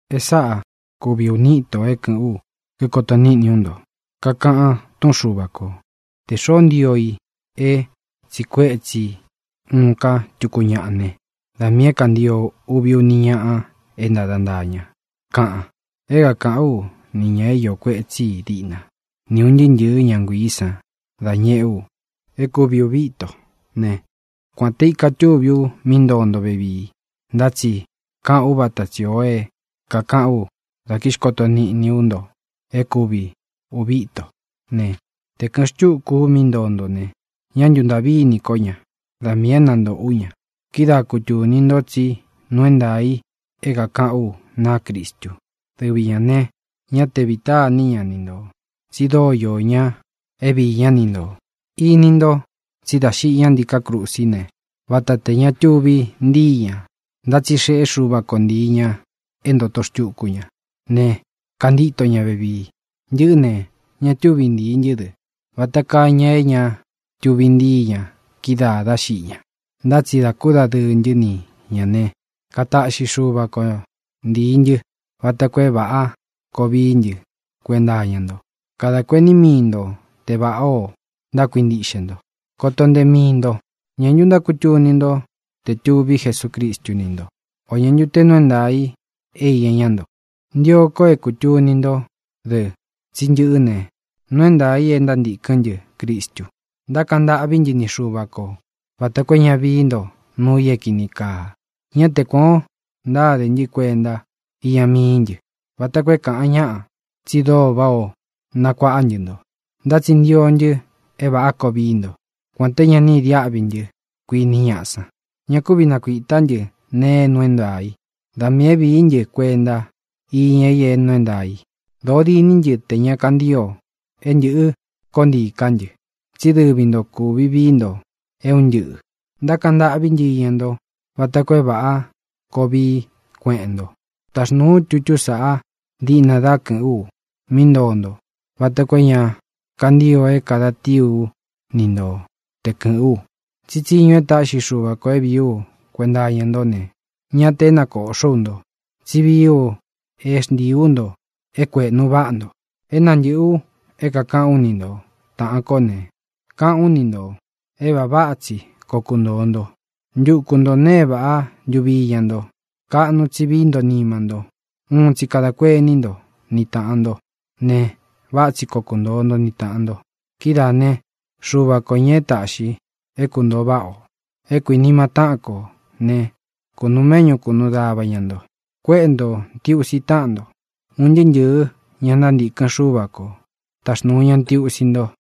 E sáꞌa kūvi uni íto é kɨ̄ꞌɨ́n u, kikoto niꞌní u nto. Kakaꞌan túꞌun Xuva kō: “Tē xoó ntio i é tsiꞌi kuétsi uun ká tuku ñaꞌa ne, da miī é kāntio uvi, uni ñaꞌa é ntāda ntaá ña”, kaꞌan. É kākaꞌán u ni ñā é iō kuetsí i diꞌna, nī é un ntɨɨ́ ntɨ̄ɨ́ ña nguiī san dá ñeꞌé u é kuvi ūvi íto ne, kuān te ika túví u mí ntoo nto vevii, ntá tsi kāꞌán u vata tsī o é kākaꞌán u dá kixkoto niꞌní u nto é kuvi ūvi íto ne, te kɨ̄ꞌɨn xtúku u mí ntoo nto ne, ñá ntuntāꞌví ini kó ña; da miī é nantōꞌo ú ña. Kidáa kutūni nto tsí nuu é ntaā i é kākaꞌán u naá Cristu. Dɨvi ñā ne, ñá te vītá ini ña ni ntō, tsi dóo iō ña é viī ñá ni ntō. Ini nto tsí dā xiꞌi ñá ntiká krusí ne, vata te ña tuvi ntíi ñā, ntá tsi xeꞌé Xuva ko ntīi ña é ntōto xtuku ña ne, kantíto ña vevii. Ntɨꞌɨ́ ne, ña túvi ntīi ntɨ́ dɨ, vata kaa ña é ña tuvi ntíi ña kídaā dá xiꞌi ña, ntá tsi dā kúdadɨɨ ntɨ́ ni ñā ne, kataꞌxi Xúva ko ntīi ntɨ́ vata koo é vāꞌá koo vií ntɨ kuenta iña nto. Kadā kuení mii nto te vāꞌá ō ntákuintiꞌxe nto. Koto ntee mii nto. ¿Ñā ntu ntákutuni nto te tūví Jesucristu ni ntó, o ñā ntu te nuu é ntaā i é iña ña nto? Ntio ko é kūtuni ntó dɨ tsí ntɨꞌɨ́ ne, nuu é ntaā i é ntántīkɨ́n ntɨ Cristu. Ntákaꞌan ntâꞌví ntɨ ni Xuva ko vāta koo é ña vií nto nuu i é kīni kaa. Ñá te kuān o ntáde ntɨ́ kuenta iña mií ntɨ, vata koo é kāꞌan ñaꞌa tsi dóo váꞌā o nakuaꞌá ntɨ nto, ntá tsi ntio ntɨ é vāꞌá koo vií nto, kuān te ña ni idiáꞌvi ntɨ́, kuiní ñaꞌa san. Ña kúvi nakuītá ntɨ nee é nuu é ntaā i. Da miī é vīí ntɨ kuenta iña i é nuu é ntaā i. Dōo diní ntɨ tē ña kantio é ntɨ̄ꞌɨ́ koó ntiī ká ntɨ, tsí dɨvi nto kūvi vií nto é un ntɨꞌɨ̄. Ntákaꞌan ntâꞌví ntɨ iña nto vata koo é vāꞌá koo vií kueꞌen nto. Taxnūu ú tutú saꞌa diꞌna dá kɨ̄ꞌɨ́n u mí ntoo nto vata koo é ña kantío é kāda tii ú ni nto te kɨ̄ꞌɨ́n u. Tsí tsiñu e táꞌxi Xuva kō é vīí u kuenta iña ntó ne, ñá tē é nakōꞌxó u nto, tsí vií u é xntiī ú nto é kuēꞌnu váꞌa nto. É nantɨꞌɨ̄ u é kākaꞌán u ni nto, táꞌān kó ne, káꞌān ú ni ntō é vāꞌa váꞌa tsi koo kuntōo nto. Ntuku nto nēe e váꞌa ntuvi iña nto. Kaꞌnu tsi víi nto nima nto. Uun tsi kadā kuení nto ni tāꞌan nto ne, váꞌa tsi koo kuntoo nto ni tāꞌan nto. Kidáā né, Xuva kō, ña é tāꞌxi é kuntōo váꞌa ō, é kuinima táꞌan ko ne, kunūu méꞌñu kūnuu dava ña nto. Kuéꞌe ntō ntiusi táꞌan nto. Un ntɨɨ́ ntɨ̄ɨ́ ña ntántīkɨn Xúva ko taxnūu ña ntiusi nto.